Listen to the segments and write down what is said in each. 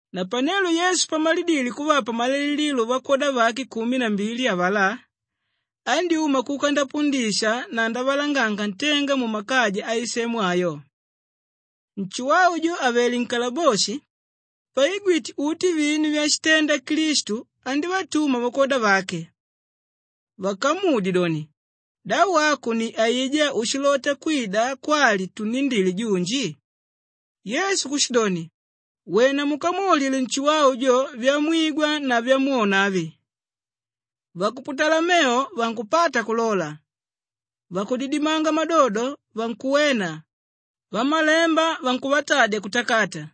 Napanelo Yesu pamalidile kuvapa malailililo vakwoda vake kumi na mbili avalá, andyúma kuka ndapundisha na ndavalanganga ntenga mumakaja aisemu ayo. Nshuwau jo àvele nkalaboshi, paigwite uti vinu vyashitenda Klistu andívatuma vakwoda vake vakamudye doni, “Da wako ni aijá úshilota kwida kwali tunnindile junji?” Yesu kushidoni, “Wena mukamwaulile Nshuwau jo vyamwigwa na vyamwona avi. Vakuputala mevo vankupata kulola, vakudidimanga madodo vankuwena, vamalemba vankuvatadya kutakata,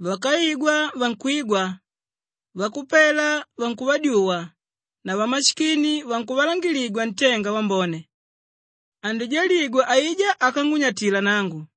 vákaigwa vankwigwa, vakupela vankuvadyuwa na vamashikini vankuvalangangiligwa ntenga wambone. Andijaligwa aijá ákangunyatila nangu.”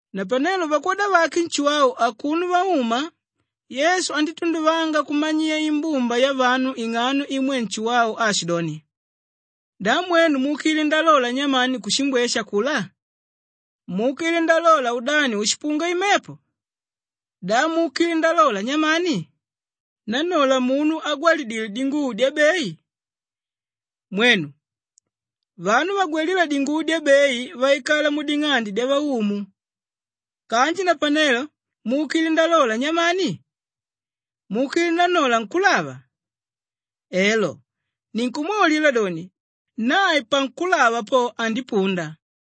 Napanelo vakwoda vake Nshuwau akuno vauma, Yesu andítunduvanga kumanyiya imbumba yavanu ing'ano imwe Nshuwau aashidoni, “Da mwenu muukile ndalola nyamani kushimbweshe akulá? Muukile ndalola udani úshipunga imepo? Da muukile ndalola nyamani? Nannola munu ágwalidile dinguvo dyabei? Mwenu, vanu vagwalíla dinguvo dyabei vaikala muding'ande dyavaumu. Kanji napanelo muukile ndalola nyamani? Muukile nannola nkúlava? Elo, ninkumwaulila doni, nae pankulava po, andipunda.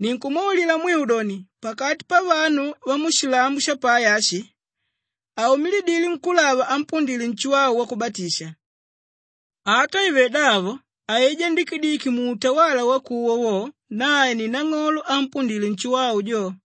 “Ninkumwaulila mwiu doni, pakati pavanu vamushilambo shapai ashi, haumilidile nkúlava ámpundile Nshuwau Wakubatisha. Ata ive davo aijá ndikidiki muutawala wakuwa wo, nae ni nang'olo ámpundile Nshuwau jo.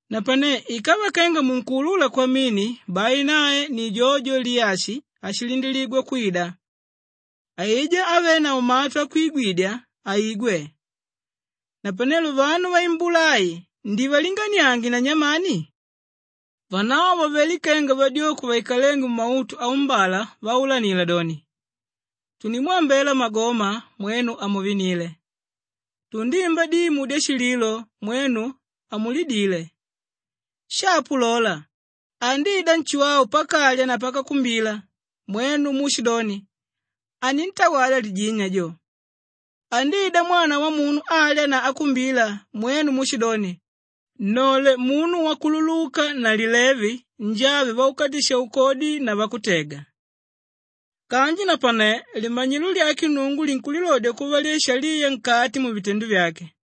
napane ikava kenga munkuulula kwamini, bai nae ni jojo Liyashi áshilindiligwa kwida. Aijá ávenavo matu akwigwidya, aigwe. “Napanelo vanu vaimbula ai ndivalinganiange na nyamani? Vanavo vavelé kenga vadyoko vaikalénge mumautu aumbala vaulanila doni, “ ‘Tundimwambela magoma, mwenu hamuvinile. Tundimba dimu dyashililo, mwenu hamulidile.’ “Shapo lola, andida Nshuwau pakalya na pakakumbila, mwenu muushidoni, ‘Anintawala lijini ajo.’ Andida Mwana Wamunu alya na akumbila, mwenu muushidoni, ‘Nnole munu wakululuka na lilevi, njave vakukatisha-ukodi na vakutega.’ Kanji napane limanyilo lyake Nnungu linkulilodya kuva lyashaliya nkati muvitendo vyake.”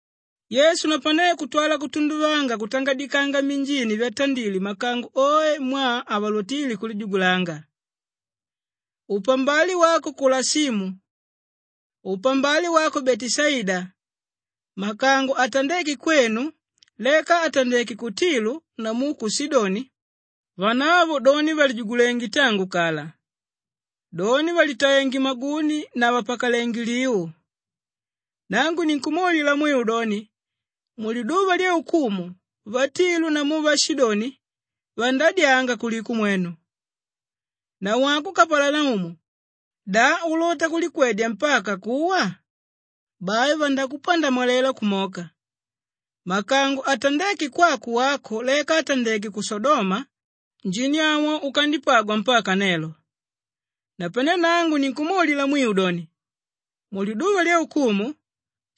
Yesu napane kutwala kutunduvanga kutangadikanga minjini vyatandile makango oe mwaa havalotíle kulijugulanga, “Upambale wako Kolashimu! Upambale wako Beteshaida! Makango atandéke kwenu leka àtandeke ku Tilu namu ku Shidoni, vanavo doni vàlijugulenge tangu kala. Doni vàlitaenge maguni na vàpakalenge liu. Nangu ninkumwaulila mwiu doni, muliduva lyaukumu vatilu namu vashidoni vandadyanga kuliko mwenu. Nawako Kapalanaumu! Da ulota kulikwedya mpaka kuwa? Bai vandakupandamwalela kumoka. Makango atandéke kwako wako leka àtandeke ku Shodoma, njini awo ukandipagwa mpaka nelo. Napane nangu ninkukwaulila mwiu doni, muliduva lyaukumu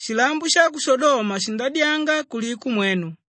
shilambo sha ku Shodoma shindadyanga kuliko mwenu.”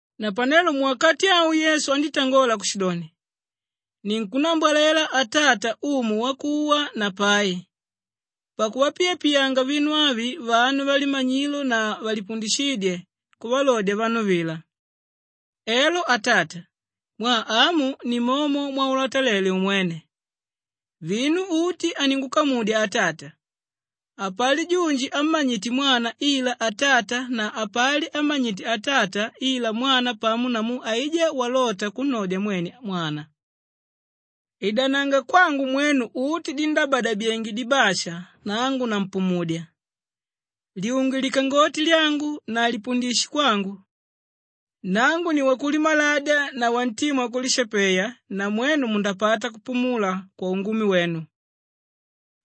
Napanelo muwakati awo Yesu andítangola kushidoni, “Ninkukulambwalela Kwali: Ninkukutumbyanga… Atata, Umu wakuwa na pai, pakuvapiyanga vinu avi vanu valimanyilo na valipundishídye kuvalodya vanu vila. Elo Atata, mwaa amu ni momo mwaulatalele umwene. Vinu uti aningukamudya Atata. Hapali junji ámmanyite Mwana ila Atata na hapali ámmanyite Atata ila Mwana pamo namu aijá walota kunnodya mwene Mwana. “Idananga kwangu mwenu uti díndabadabyenge dibasha, nangu nampumudya. Lyunge likangoti lyangu na lipundishe kwangu. Nangu ni wakulimaladya na wantima wakulishapeya na mwenu mundapata kupumula kwaungumi wenu.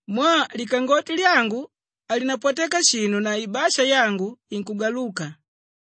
Mwaa likangoti lyangu halinapwateka shinu na ibasha yangu inkugaluka.”